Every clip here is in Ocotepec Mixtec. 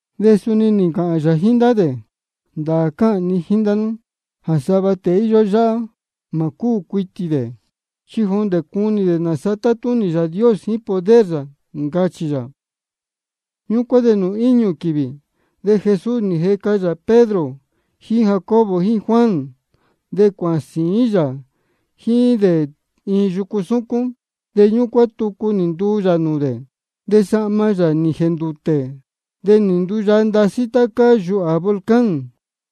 De suni nī ncāhān yā jíín ndá dē: Ndāā cáhān ni jíín ndá nú jā sava tēe íyó yáhá, mā cúū cuitī dē chi jondē cunī dē nāsa tátúnī Yāā Dios jíín poder yā, ncachī yā. Ñúcuán de nūū íñū quīvī, de Jesús nī jeca yā Pedro jíín Jacobo jíín Juan, de cuāhān sīín yā jíín dē iin yucu súcún. De ñúcuán, tucu nī nduu yā nūū dē. De sahma yā nī jēndūtē, de nī nduyaa ndasí tá cáá yūhā volcán.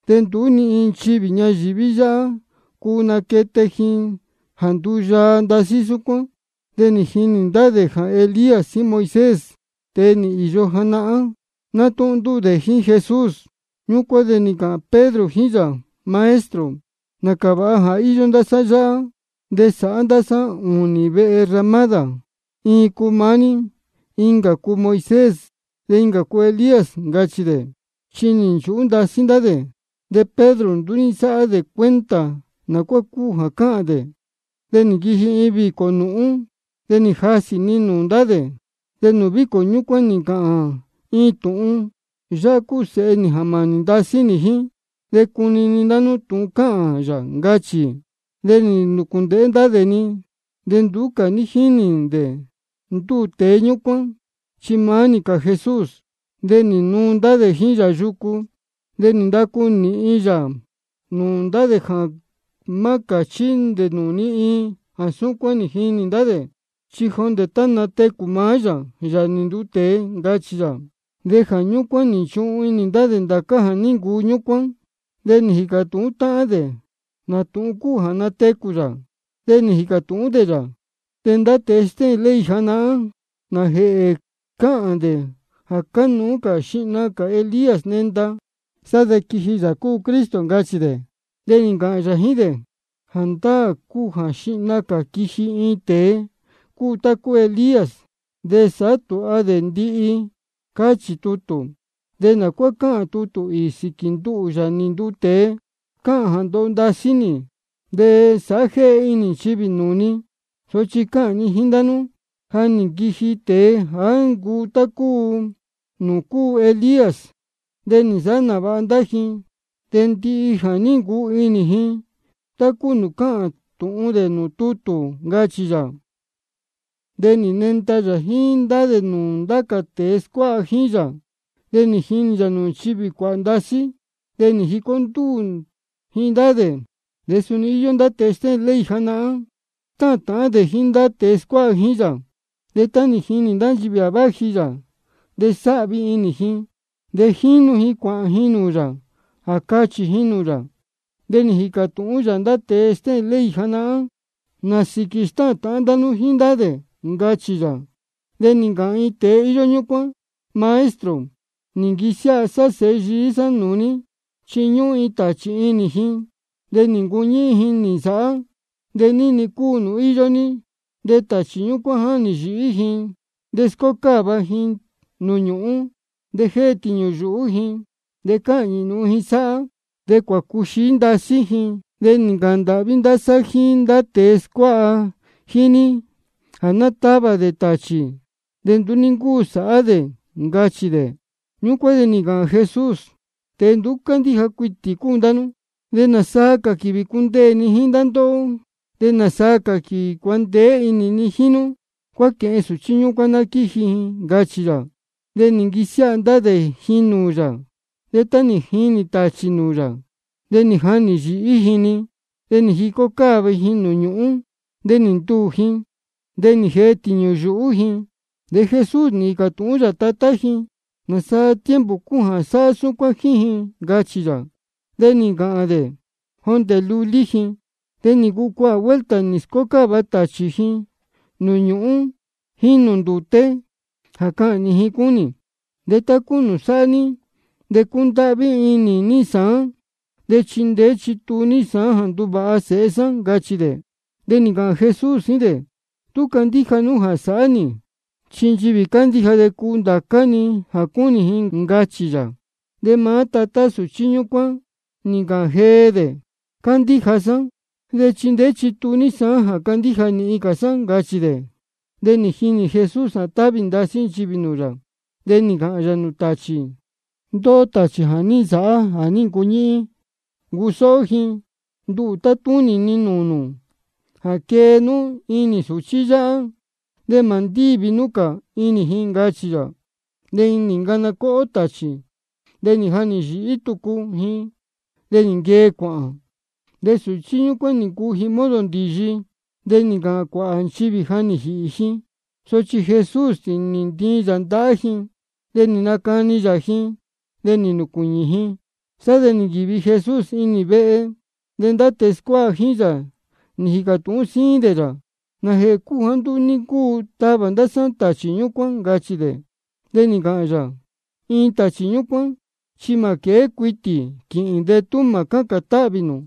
De nduú ni iin nchivī ñayīví yáhá cuu naquete ji jā nduyaa ndasí súcuán. De nī jinī ndá dē jā Elías jíín Moisés, tēe nī īyo janahán, nátúhún ndúū dē jíín Jesús. Ñúcuán de nī ncāhān Pedro jíín yā: Maestro, nācā vāha jā íyó ndá sá yáhá, de ná sáhá ndá sá ūnī vehe ramádā, iin cuu maá ní, incā cuu Moisés, de incā cuu Elías, ncachī dē. Chi nī nchūhú ndasí ndá dē, de Pedro nduú ní nsáhá dē cuenta nā cuá cúu jā cáhān dē. De nī nquiji iin vīcō nūhún, de nī jasī-ni nūū ndá dē. De nūū vīcō ñúcuán nī ncāhān iin tūhun: Yáhá cúu Sēhe nī jā mānī ndasí nī jíín. De cunini ndá nú tūhun cáhān yā, ncachī. De nī nūcūndēhé ndá dē-ni, de nduú cā ní jínī dē ndúū tēe ñúcuán, chi maá-ni cā Jesús. De nī nuu ndá dē jíín yā yucu. De nī ndacu nīhin yā nūū dē jā má cāchí dē nūū ni iin jā súcuán nī jinī ndá dē, chi jondē tá natecū maá yā, Yāā nī nduu tēe, ncachī yā. Jā ñúcuán nī nchuhun inī ndá dē ndācá jā ní ncuu ñúcuán, de jícā tūhún táhán dē nā tūhun cúu jā natecū yā. De nī jīcā tūhún dē yā: De ndá tēe stéhēn ley janahán, ¿nājēhē cáhān dē jā cánuú jā xihna cā Elías nenda, sá de quiji Yāā cúu Cristo? ncachī de. De nī ncāhān yā jíín dē: Jāndáā cúu jā xihna cā quiji iin tēe cuu tá ncuu Elías, de sāhá tūha dē ndihi, cáchī tutū. ¿De nā cuá cáhān tucu tutū īī sīquī nduhū, Yāā nī nduu tēe? Cáhān jā ndoho ndasí nī, de sāhá jéhe inī ji nūū ni. Sochi cáhān ni jíín ndá nú, ja nī nquiji tēe jāá ncuu tá cúu nūū ní ncuu Elías, de nī nsāhá nāvāha ndá ji dē ndihi jā ní ncuu inī ji, tá cúu nūū cáhān tūhun dē nūū tutū, ncachī yā. De nī nenda yā jíín ndá dē nūū ndá cā tēe scuáha jíín yā, de nī jinī yā nchivī cuāhā ndasí, nī jicó ndúū ji ndá dē. De suni íyó ndá tēe stéhēn ley janahán, stáhān tāhán dē jíín ndá tēe scuáha jíín yā. De tá nī jinī ndá nchivī jā váji yā, de sáhvi inī ji, de jínu ji cuāhān ji nūū yā jā cāhān ji jíín yā. De nī jīcā tūhún yā ndá tēe stéhēn ley janahán: ¿Nā sīquī stáhān tāhán ndá nú jíín ndá dē? ncachī yā. De nī ncāhān iin tēe íyó ñúcuán: Maestro, nī nquisiáha sá sēhe yií sá nūū ní, chi ñúhún iin tāchī inī ji, de nī ncuñíhín ji nī nsāhá. De ní-ni cúu nūū íyó ji, de tāchī ñúcuán jáhnī yīhí ji de scócáva ji nūū ñūhún. De jée tīñū yuhú ji, de cáhñī nūhun ji sáhá. De cuācuxií ndasí ji. De nī ncāhān ndāhví sá jíín ndá tēe scuáha jíín ní jā ná távā dē tāchī, de nduú ní ncúu sāhá dē, ncachī dē. Ñúcuán de ni ncāhān Jesús: Tēe nduú cándíja cuitī cúu ndá nú. ¿De nāsaa cā quīvī cundeē ni jā ndoho nī jíín nú? ¿De nāsaa cā quīvī cuandeé inī ni jíín nú? Cuáquēhen sūchí ñúcuán ná quíji ji, ncachī yā. De nī nquisiáha ndá dē ji nūū yā. De tá nī jinī tāchī nūū yā, de nī jahnī yīhí ji-ni. De nī jicó cáva ji nūū ñūhún, de nī ntuū ji, de nī jee tīñū yuhú ji. De Jesús nī jīcā tūhún yā tatá ji: ¿Nāsaa tiempo cúu jā sáhá súcuán jíín ji? ncachī yā. De nī ncāhān dē: Jondē lulí ji. De nī ncuu cuāhā vuelta nī scócáva tāchī ji nūū ñúhūn jíín nūū ndūté, jā cahnī ji cúnī. De tú cuu sāhá ní, de cundáhví inī ní sāán de chindeé chituu ní sāán jā nduvāha sēhe sá, ncachī dē. De nī ncāhān Jesús jíín dē: Tú cuu candíja nú jā sāhá nī, chi nchivī cándíja de cuu ndācá-ni jā cúnī ji, ncachī yā. De maá tatá sūchí ñúcuán nī ncāhān jee dē: Cándíja sá, de chindeé chituu ní sāán jā candíja nīhin cā sá, ncachī dē. De nī jinī Jesús jā távī ndasí nchivī nūū yā. De nī ncāhān yā nūū tāchī: Ndóhó tāchī jā ní nsāhá jāá ncuñíhín ncusóhó ji, nduhū tátúnī ni nūū nū jā quee nú inī sūchí yáhá, de mā ndívi nú cā inī ji, ncachī yā. Ñúcuán de nī ncana cóhó tāchī, de nī jahnī yīhí tucu ji, de nī nquee cuāhān. De sūchí ñúcuán nī ncuu ji modo ndīyi, de nī ncāhān cuāhā nchivī jā ní jīhī ji. Sochi Jesús nī ntiin yā ndahá ji, de nī nacani yā ji, de nī nūcuīñī ji. Sá de nī nquīvi Jesús inī iin vehe, de ndá tēe scuáha jíín yā nī jīcā tūhún síín dē yā: ¿Nājēhē cúu jāá nduú ní ncúu tavā ndá sá tāchī ñúcuán? ncachī dē. De nī ncāhān yā: Iin tāchī súcuán, chi mā quēé cuitī quīhīn de tú mā cácān táhvī nū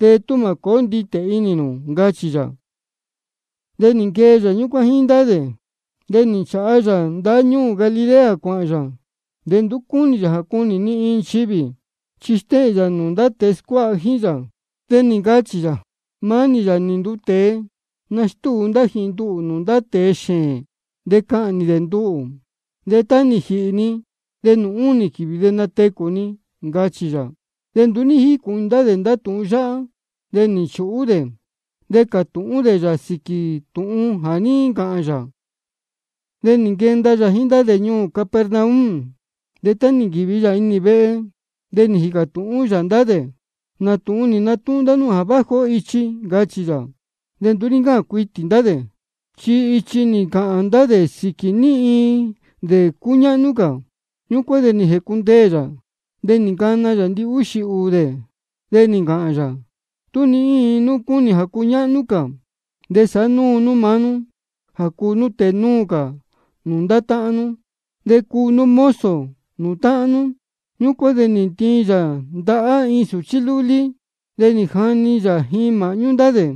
de tú mā cōó nditē inī nū, ncachī yā. De nī nquee yā ñúcuán jíín ndá dē, de nī nchāha yā ndáñúū Galilea cuāhān yā. De nduú cúnī yā jā cunī ni iin nchivī. Chi stéhēn yā nūū ndá tēe scuáha jíín yā, de ncachī yā: Maá nī, Yāā nī nduu tēe, nastúu ndá ji nduhū nūū ndá tēe xēēn. De cahnī dē nduhū, de tá nī jīhī ni, de nūū únī quīvī de natecū ni, ncachī yā. De nduú ní jícūhun inī ndá dē tūhun yáhá, de nī nchūhú dē cātūhún dē yā sīquī tūhun jā ní ncāhān yā. De nī nquenda yā jíín ndá dē ñuū Capernaum, de tá nī nquīvi yā inī vehe, de nī jīcā tūhún yā ndá dē: ¿Nā tūhun nī natúhún ndá nú jā váji ó ichi? ncachī yā. De nduú ní ncáhān cuitī ndá dē, chi ichi nī ncāhān ndá dē sīquī ní iin dē cúñáhnú cā. Ñúcuán de nī jēcundeē yā, de nī ncana yā ndihúxī ūū dē, de nī ncāhān yā: Tú ní iin nú cúnī jā cuñáhnú cā, de sa sāhá nú maá nú jā cuu nú tēe núu cā nūū ndá táhán nú, de cuu nú mozo nūū táhán nú. Ñúcuán de nī ntiin yā ndahá iin sūchí lúlí, de nī jani yā ji māhñú ndá dē.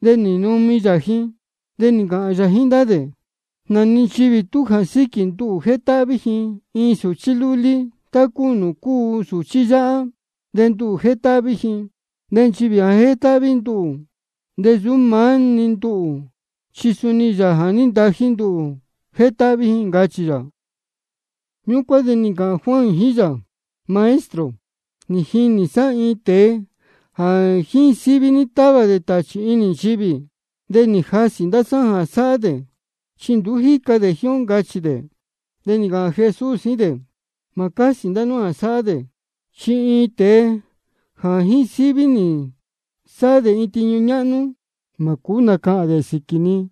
De nī numi yā ji, de nī ncāhān yā jíín ndá dē: Nā-ni nchivī de tú jā síquī nduhū jétáhví ji iin sūchí lúlí tá cúu nūū cúu sūchí yáhá, de nduhū jétáhví ji. De nchivī jā jétáhví nduhū, de nsūú maá-ni nduhū, chi suni Yāā jā ní ntají nduhū jétáhví ji, ncachī yā. Ñúcuán de nī ncāhān Juan jíín yā: Maestro, nī jinī ndá sá iin tēe jā jíín síví ní távā dē tāchī inī nchivī. De nī jasī ndá sá jā sáhá dē, chi nduú jíca dē jíín ó, ncachī dē. De nī ncāhān Jesús jíín dē: Mā cásī ndá nú jā sáhá dē. Chi ni iin tēe jā jíín síví nī sáhá dē tiñu ñáhnú, mā cūú nacahān dē sīquī ni.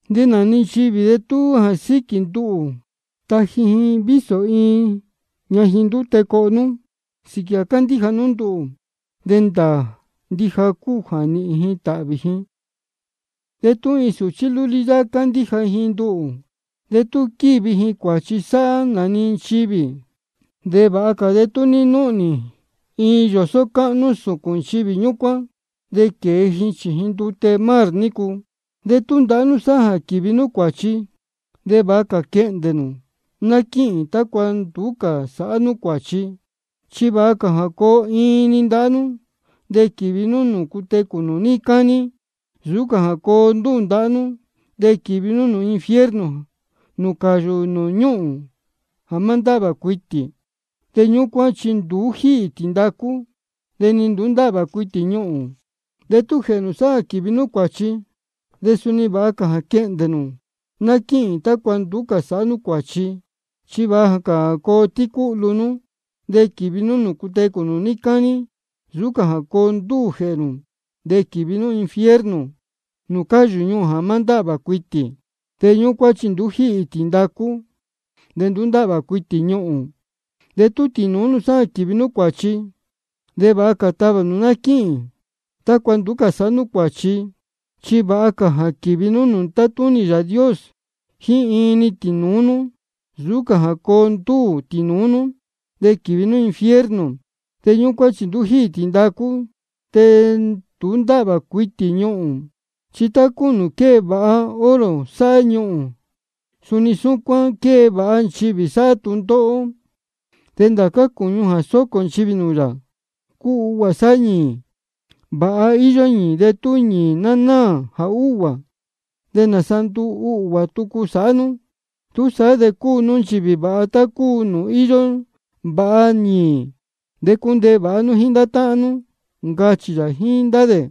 De nā-ni nchivī de tú jā síquī nduhū taji ji vísō iin ñajin ndute coho nú, sīquī jā cándíja nú nduhū, de ndāā ndija cúu jā nīhīn ji tāhvī ji. De tú iin sūchí lúlí yáhá cándíja ji nduhū, de tú quīvi ji cuāchi sāhá nā-ni nchivī, de vāha cā de tú ní núhnī iin yōsó cáhnú sūcūn nchivī ñúcuán, de quēe ji chījin ndute mar nícu. De tú ndahá nú sáhá jā quīvi nú cuāchi, de vāha cā quehndē nū ná quíhīn, tácua nduú cā sāhá nú cuāchi. Chi vāha cā jā coo iin-ni ndahá nú de quīvi nú nūū cutecū nū níí cání, nsūú cā jā coo ndúū ndahá nú de quīvi nú infierno, nūū cáyū ñuhūn jā má ndáhvā cuitī. De ñúcuán chi nduú jíhī tīndacú, de nduú ndáhvā cuitī ñuhūn. De tú jēhē nū sáhá jā quīvi nú cuāchi, de suni vāha cā quehndē nū ná quíhīn, tácua nduú cā sāhá nú cuāchi. Chi vāha cā jā coo tícúhlu nú de quīvi nú nūū cutecū nū níí cání, nsūú cā jā coo ndúū jēhē nū de quīvi nú infierno, nūū cáyū ñuhūn jā má ndáhvā cuitī. De ñúcuán chi nduú jíhī tīndacú, de nduú ndáhvā cuitī ñuhūn. De tú tīnūú nú sáhá jā quīvi nú cuāchi, de vāha cā tavā nū ná quíhīn, tácua nduú cā sāhá nú cuāchi. Chi vāha cā jā quīvi nú nūū tátúnī Yāā Dios jíín iin-ni tīnūú nú, nsūú cā jā coo ndúū tīnūú nú de quīvi nú infierno. De ñúcuán chi nduú jíhī tīndacú, de nduú ndáhvā cuitī ñuhūn. Chi tá cúu nūū quée vāha oro sáhá ñuhūn, suni súcuán quée vāha nchivī sáhá tūndóhó. De ndācá cūñu jā sócō nchivī nūū yā, cúu uhguā sáhá ñīī. Vāha íyó ñīī, de tú ñīī ná náā jā úhguā, ¿de nāsa nduu uhguā tucu sāhá nú? Túsaá de cuu nú nchivī vāha, tá cúu nūū íyó vāha ñīī. De cundeē vāha ndá nú jíín táhán nú, ncachī yā jíín ndá dē.